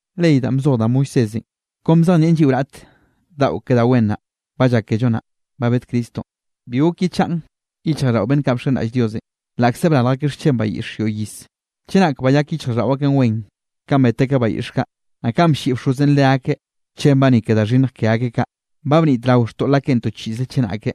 Ley danꞌ bzoj da Moisésenꞌ, kon bzejnieꞌn lliꞌo raꞌt daꞌo ke da wen naꞌ ba llak kello nnaꞌ ba bed Cristonꞌ. Bi gok yechaꞌn yichjraꞌlldaꞌo beꞌnn kaꞌ bxenraꞌll Diosenꞌ, laꞌkze brarj akeꞌ xchen bayiꞌx yoꞌy iz. Chenak bayak yichjraꞌlldaꞌo akeꞌn wen, kanꞌ bet akeꞌ bayiꞌx kaꞌ, naꞌ kanꞌ blliꞌ bxozenꞌ leakeꞌ xchenbaꞌ ni ke da xhinnj ke akeꞌ kaꞌ, ba bnitrao xtoꞌl akeꞌn to chiꞌze chenake,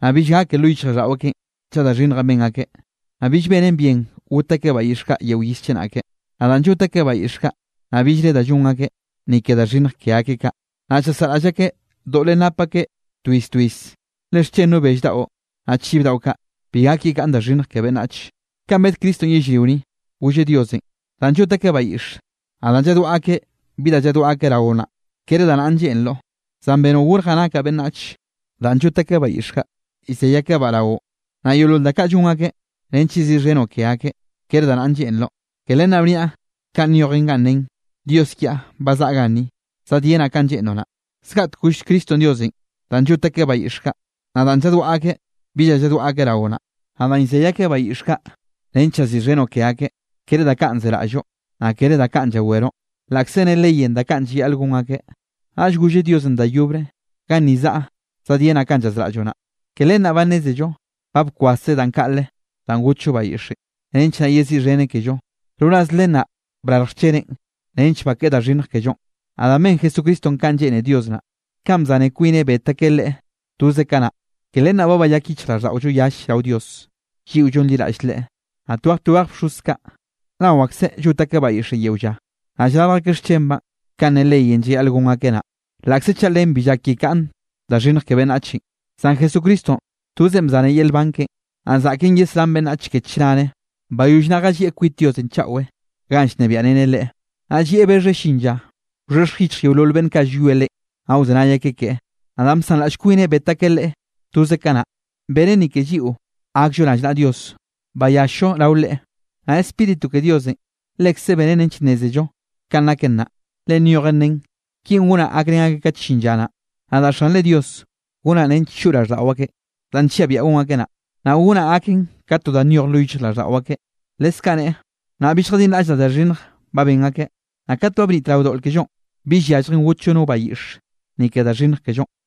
naꞌ bill gake lo yichjraꞌlldaꞌo akeꞌn chaꞌ da xhinnjenꞌ ben akeꞌ, naꞌ bill benen bien got akeꞌ bayiꞌx kaꞌ yeo iz chenake. Naꞌ danꞌ llot akeꞌ bayiꞌx kaꞌ, naꞌ billre da llon akeꞌ, ni ke da xhinnj ke akeꞌ kaꞌ, naꞌ llasaꞌraꞌll akeꞌ doꞌlenꞌ nap akeꞌ to iz to iz. Le xchen no bell daꞌo, naꞌ chiv daꞌo kaꞌ, bi gak yekaꞌn da xhinnj ke beꞌnnach. Kanꞌ bed Cristonꞌ yellrio ni, golleꞌ Diosenꞌ: Danꞌ llot akeꞌ bayiꞌx, naꞌ danꞌ lladwaꞌa akeꞌ bi da lladwaꞌa akeꞌ raoꞌ naꞌ, kere da naꞌn lleꞌnroꞌ. Zan benoꞌ gorjaꞌ nakaꞌ beꞌnnach. Danꞌ llot akeꞌ bayiꞌx kaꞌ llzey akebaꞌ raoꞌ, naꞌ yeolol da kaꞌ llon akeꞌ nench yeziꞌxhenoꞌ ke akeꞌ, kere da naꞌn lleꞌnroꞌ. Ke len naꞌ bniaꞌ kanꞌ nyojen ganꞌ nen: “Dios kiaꞌ ba zaꞌa ganni, zadyenaꞌ kanꞌ lleꞌnroꞌ naꞌ.” Zgaꞌtek goll Cristonꞌ Diosenꞌ: “Danꞌ llot akeꞌ bayiꞌx kaꞌ, naꞌ danꞌ lladwaꞌa akeꞌ bi da lladwaꞌa akeꞌ raoꞌ naꞌ, naꞌ danꞌ llzey akeꞌ bayiꞌx kaꞌ nench yeziꞌxhenoꞌ ke akeꞌ, kere da kaꞌn zeraꞌlloꞌ, naꞌ kere da kaꞌn llaweroꞌ”, laꞌkze ne leyenꞌ da kaꞌn llayaꞌl gon akeꞌ. Naꞌll golleꞌ Diosenꞌ da yobre: “Ganni zaꞌa zadyenaꞌ kanꞌ llazraꞌlloꞌ naꞌ”. Ke len naꞌ ba nnézello ba bkwaseꞌ danꞌ kaꞌle danꞌ gotllo bayiꞌxenꞌ, nench naꞌ yeziꞌxheneꞌ kello; roraz len naꞌ brarj xcheneꞌn nench bakeꞌe da xhinnj kellonꞌ. Naꞌ danꞌ ben Jesucristonꞌ kanꞌ lleꞌne Dios naꞌ, kanꞌ bzane kwineꞌ bet akeꞌ Leꞌe toze kanaꞌ, ke len naꞌ ba bayak yichjraꞌlldaꞌollo yall rao Dios, lliꞌo llonliraꞌll Leꞌe. Naꞌ twej twej bxoz kaꞌ, nao akseꞌ llot akeꞌ bayiꞌxenꞌ yeo lla, naꞌ llrarj akeꞌ xchenbaꞌn kanꞌ ne leyenꞌ llayaꞌl gon akeꞌ naꞌ, laꞌkze chaꞌ len bi llak yekaꞌn da xhinnj ke beꞌnnachenꞌ. Zan Jesucristonꞌ tozeꞌn bzaneꞌ yel nban keꞌen, naꞌ zaꞌken yesrán beꞌnnach ke chnare. Bayoll naꞌ jallieꞌ kwit Diosenꞌ chaꞌwe ganꞌ llnebiaꞌreneꞌ Leꞌe. Naꞌn llieꞌ bexheꞌ llin lla, wxhexj yichj yeolol beꞌnn kaꞌ llwie Leꞌe, naꞌ wzenay akeꞌ keꞌe. Naꞌ danꞌ bsanraꞌll kwineꞌ bet akeꞌ Leꞌe toze kanaꞌ, beneꞌn ni ke lliꞌo gakllo rallnaꞌa Dios bayall-llo rao Leꞌe. Naꞌ Spíritu ke Diosenꞌ, lekze benen nench nnézello kanꞌ naken naꞌ, le nyojen nen: Kinꞌ gonaꞌ gakrén akeꞌ kat llin lla naꞌ. Nadaꞌ Xanre Dios gonaꞌ nench choꞌ raꞌlldaꞌo akeꞌ danꞌ nlliaꞌ biaꞌa gon akeꞌ naꞌ. Naꞌ gonaꞌ gaken ka to da nyoj lo yichjraꞌlldaꞌo akeꞌ. Leskaꞌ neꞌe: Nnaꞌ bill lljadinraꞌllaꞌ da xhinnjenꞌ ba ben akeꞌn. Naꞌ kat ba bnitrao doꞌl kellonꞌ, bill yalljen gotllo no bayiꞌx, ni ke da xhinnj kellonꞌ.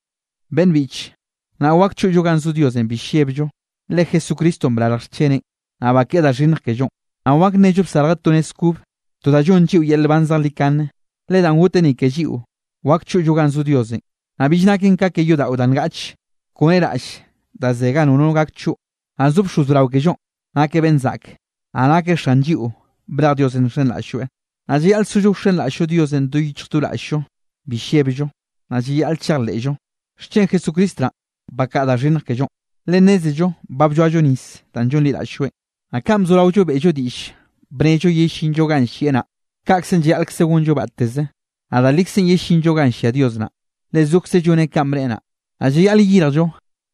Beꞌnn biꞌche, nnaꞌ wak choꞌllo ganꞌ zo Diosenꞌ bi llebllo, le Jesucristonꞌ brarj xcheneꞌn, naꞌ bakeꞌe da xhinnj kellonꞌ. Naꞌ wak nnello bsarjeꞌ to nez kobe, to da llonn lliꞌo yel nban zejlikane, le danꞌ goteꞌ ni ke lliꞌo, wak choꞌllo ganꞌ zo Diosenꞌ, naꞌ bill naken ka ke yodaꞌo da ngaꞌch kone raꞌll da ze ganꞌ nono gak choꞌ. Naꞌ zo bxoz brao kellonꞌ nakeꞌ beꞌnn zaꞌke, naꞌ nakeꞌ Xan lliꞌo brej Diosenꞌ nxenraꞌll-lloeꞌ. Naꞌ llayaꞌl sollo wxenraꞌll-llo Diosenꞌ do yichj do raꞌll-llo bi llebllo, naꞌ llayaꞌl chejleꞌllo, xchen Jesucristo naꞌn bakaꞌa da xhinnj kellonꞌ, le nnézello ba blloallo nis danꞌ llonliraꞌll-lloeꞌn. Naꞌ kanꞌ bzoraollo beꞌllo diꞌll bnello yellinllo ganꞌ llieꞌ naꞌ, kaꞌkzenꞌ llayaꞌlkze gonllo batteze, naꞌ da likzenꞌ yellinllo ganꞌ llia Dios naꞌ, le zokzeꞌ lloneꞌ kanꞌ bneꞌe naꞌ. Naꞌ llayaꞌl yeyirjllo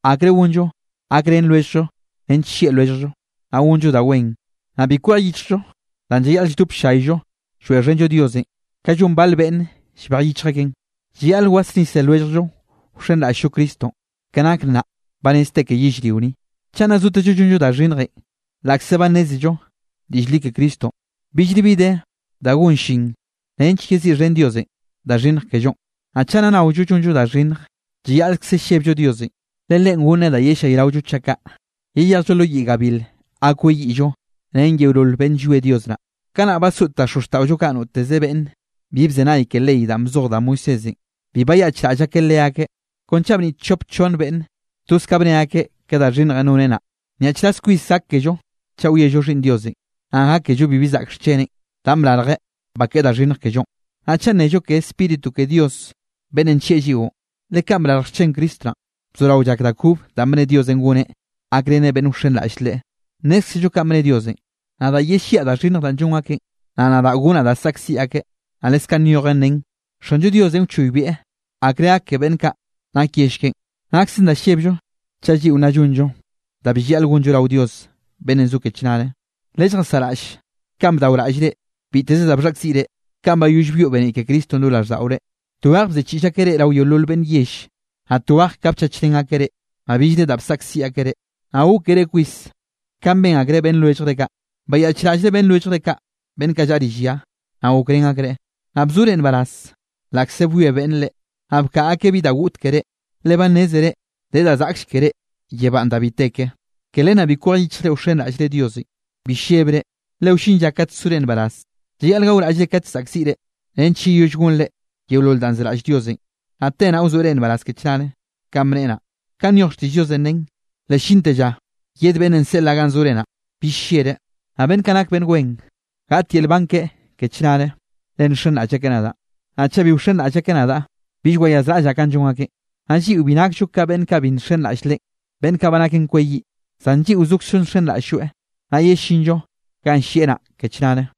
akre gonllo gakrén lwelljllo nench llieꞌ lwelljllo, naꞌ gonllo da wen. Naꞌ bi kwej yichjllo danꞌ llayaꞌl lldop ll-llayllo lloeꞌxhenllo Dios kanꞌ llon bal beꞌnn llbej yichj akeꞌn. Llayaꞌl wasnise lwelljllo wxenraꞌll-llo Cristonꞌ, ke nake nnaꞌ ba rez te ke yellrio ni. Chaꞌ nna naotezllo llonllo da xhinnjenꞌ laꞌkze ba nnézello diꞌll li ke Cristonꞌ, billre bi de da gon llin nench yeziꞌxhen Diosenꞌ da xhinnj kellonꞌ. Naꞌ chaꞌ nna naollo llonllo da xhinnj, llayaꞌlkze llebllo Diosenꞌ, le Leꞌen goneꞌ da yellayraollo chaꞌ kaꞌ, yeyejllo lo yiꞌ gabil ga kweyiꞌllo ren yeolol beꞌnn llwie Dios naꞌ. Kanaꞌ basoꞌt da xozxtaꞌollo kaꞌ noteze beꞌnne bi bzenay ke ley danꞌ bzoj da Moisésenꞌ, bi bayaꞌchraꞌll akeꞌ leakeꞌ, kon chaꞌ bniꞌt chop chonn beꞌnne, toz ka bne akeꞌ ke da xhinnjenꞌ noneꞌ naꞌ. Nyaꞌchraz kwis gak kello chaꞌ wiello Xhiꞌnn Diosenꞌ, naꞌ gákello bibi zaꞌk xcheneꞌn danꞌ brarjeꞌ bakeꞌe da xhinnj kellonꞌ, naꞌ chaꞌ nnello ke Spíritu ke Dios beꞌnnenꞌ nllieꞌ lliꞌo. Le kanꞌ brarj xchen Cristo naꞌn, bzorao llak da kob danꞌ bne Diosenꞌ goneꞌ gakreneꞌ beꞌnn wxenraꞌll Leꞌe. Nnézkzello kanꞌ bne Diosenꞌ: “Nadaꞌ yelliaꞌ da xhinnj danꞌ llon akeꞌn, naꞌ nadaꞌ gonaꞌ da saꞌkziꞌ akeꞌ.” Naꞌ leskaꞌ nyojen nen: “Xanllo Diosenꞌ wchoybieꞌ akre gak ke beꞌnn kaꞌ nak yell keꞌen.” Naksen da llebllo chaꞌ lliꞌo nna llonllo da bill llayaꞌl gonllo rao Dios beꞌnnenꞌ zo ke chnare. Lelljasaꞌraꞌll kanꞌ bdaoraꞌllre biteze da bxhaꞌkziꞌre kanꞌ bayoll byoꞌ beniꞌ ke Cristonꞌ lo raꞌlldaꞌore. Tweje bziꞌchiꞌll akeꞌ reꞌ rao yeolol beꞌnn yell, naꞌ tweje ka bchachrén akeꞌ reꞌ, naꞌ billre da bsaꞌkziꞌ akeꞌ reꞌ, naꞌ gókere kwis kanꞌ ben akreꞌ beꞌnn lwelljre kaꞌ. Bayaꞌchraꞌllre beꞌnn lwelljre kaꞌ beꞌnn kaꞌ llaꞌa rill ya, naꞌ gokrén akreꞌ, naꞌ bzore nbaraz laꞌkze bwie beꞌnne reꞌ, naꞌ bkaꞌa akeꞌ bi da goꞌt keré, le ba nnézere de da zaꞌklle keré yebánꞌ da bi te ke. Ke len naꞌ bi kwej yichjre wxenraꞌllre Diosenꞌ, bi llebre, le wllin lla kat sore nbaraz. Llayaꞌl gaoraꞌllre kat llzaꞌkziꞌre nench yeyoll gonre yeolol danꞌ zeraꞌll Diosenꞌ, naꞌ te naꞌ wazoeꞌ reꞌ nbaraz ke chnare kanꞌ bneꞌe naꞌ. Kanꞌ nyoj xtiꞌll Diosenꞌ nen: Le llinte lla yed beꞌnnenꞌ seꞌlaꞌ ganꞌ zore naꞌ, bill llereꞌ. Naꞌ beꞌnn kaꞌ nak beꞌnn wen, gaꞌt yel nban keꞌe ke chnare, le nxenraꞌll akeꞌ nadaꞌn. Naꞌ chaꞌ bill wxenraꞌll akeꞌ nadaꞌ, bill wayazraꞌllaꞌ kanꞌ llon akeꞌn. Naꞌ lliꞌo bi nakllo ka beꞌnn kaꞌ bill nxenraꞌll Leꞌe, beꞌnn kaꞌ ba naken kweyiꞌ. Zan lliꞌo zokzllo nxenraꞌll-lloeꞌ, naꞌ yellinllo ganꞌ llieꞌ naꞌ ke chnare.